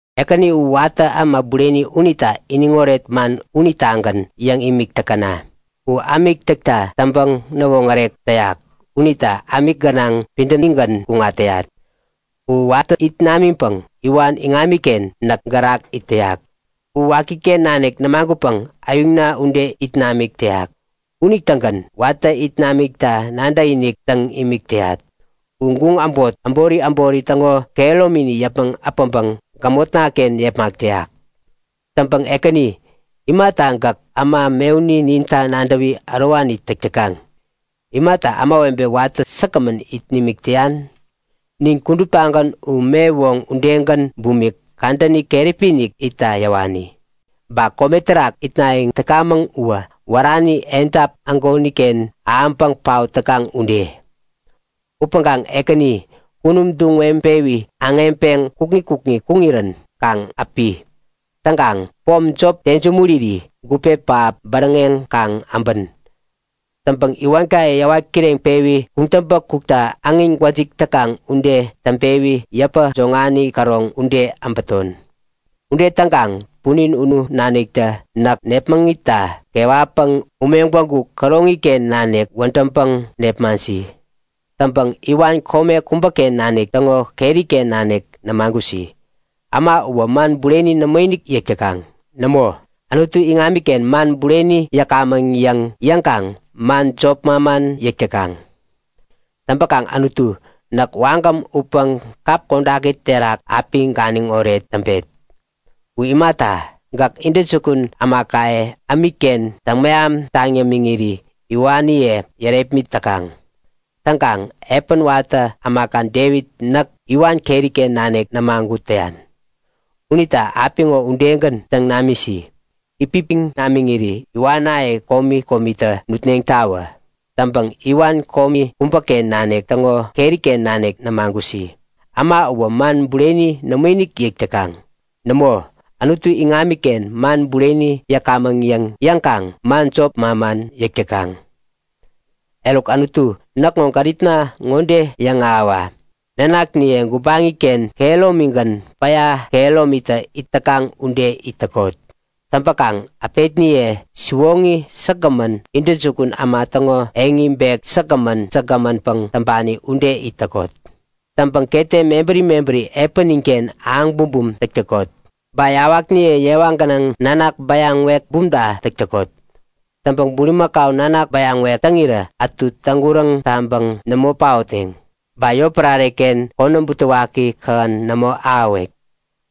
Ekäni u watä äma bureni unita iniŋoret man unitagän yäŋ imik täkäna! U ämik täkta täŋpäŋ-näwoŋärek täyak unita ämik gänaŋ pidämigän kuŋat täyat. U watä it namiŋpäŋ iwan iŋamiken näk gärak it täyak. U wakiken nanik nämagutpäŋ äyuŋna ude it namik täyak. Unitägän watä it namikta nadäkinik täŋ imik täyat. U guŋ äbot, äbori äbori täŋo kehäromini yäpmäŋ äpäŋpäŋ gämotnaken yepmak täyak. Täŋpäŋ Ekäni, imata gäk äma mewuni ninta nadäwi ärowani täk täkaŋ? Imata ämawebe watä säkgämän it nimik täyan? Nin kuduptagän u me woŋ udegän bumik, kadäni keräpi-inik itta yäwani. Ba kome terak itnayäŋ täkamäŋ uwä wärani edap ägoniken ahäŋpäŋ paot täkaŋ ude. Upäŋkaŋ Ekäni, kunum duŋ weŋpewi aŋeŋpeŋ kukŋi kukŋi kuŋirän kaŋ äpi. Täŋkaŋ pom jop tensumuriri gupe pähap bäräŋeŋ kaŋ äbän. Täŋpäŋ iwankaye yäwat kireŋpewi kuŋtäŋpä kukta äŋin gwäjik täkaŋ ude täŋpewi yäpä joŋani käroŋ ude äbäton. Ude täŋkaŋ punin unu naniktä näk nepmäŋitta kewatpäŋ ume gwägu käroŋiken nanik wädäŋpäŋ nepmaŋsi. Täŋpäŋ iwan kome kubäken nanik täŋo keriken nanik nämagusi. Äma uwä man bureni nämoinik yäk täkaŋ. Nämo, Anutu iŋamiken man bureni yäkamäŋ yäŋ yäŋkaŋ man jop manman yäk täkaŋ. Täŋpäkaŋ Anutu, näk wagäm utpäŋ kap kodaki terak api ganiŋoret täŋpet. U imata, gäk intäjukun ämakaye ämikken täŋmeham taŋ yämiŋiri iwaniye yärepmit täkaŋ. Täŋkaŋ epän watä ämaka Devit näk iwan keriken nanik nämagut täyan. Unita apiŋo udegän täŋ namisi. Itpipiŋ namiŋiri iwanaye komi komitä nutneŋtawä. Täŋpäŋ iwan kome kubäken nanik täŋo keriken nanik nämagusi. Äma uwä man bureni nämoinik yäk täkaŋ. Nämo, Anutu iŋamiken man bureni yäkamäŋ yäŋ yäŋkaŋ man jop manman yäk täkaŋ. Eruk Anutu näkŋo gäripna ŋode yäŋahäwa; Nanakniye gubaŋiken kehäromigän, päya kehäromitä it täkaŋ ude it täkot. Täŋpäkaŋ äpetniye siwoŋi säkgämän, intäjukun äma täŋo eŋi bek säkgämän säkgämänpäŋ täŋpani ude it täkot. Täŋpäŋ ketem mebäri mebäri epäninken ahäŋ bumbum täk täkot. Ba yawakniye yewa gänaŋ nanak bäyaŋ-wek bumta täk täkot. Täŋpäŋ bulimakau nanak bäyaŋ-wek täŋirä ätu täŋguräŋ taŋpäŋ nämo paotneŋ. Ba yotpärareken konäm butewaki kähän nämo ahäwek.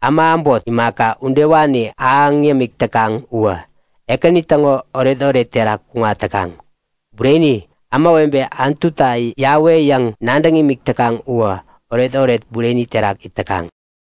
Äma äbot, imaka udewani ahäŋ yämik täkaŋ uwä, Ekäni täŋo oretoret terak kuŋat täkaŋ. Bureni, ämawebe Anutunita Yawe yäŋ nadäŋ imik täkaŋ uwä oretoret bureni terak it täkaŋ.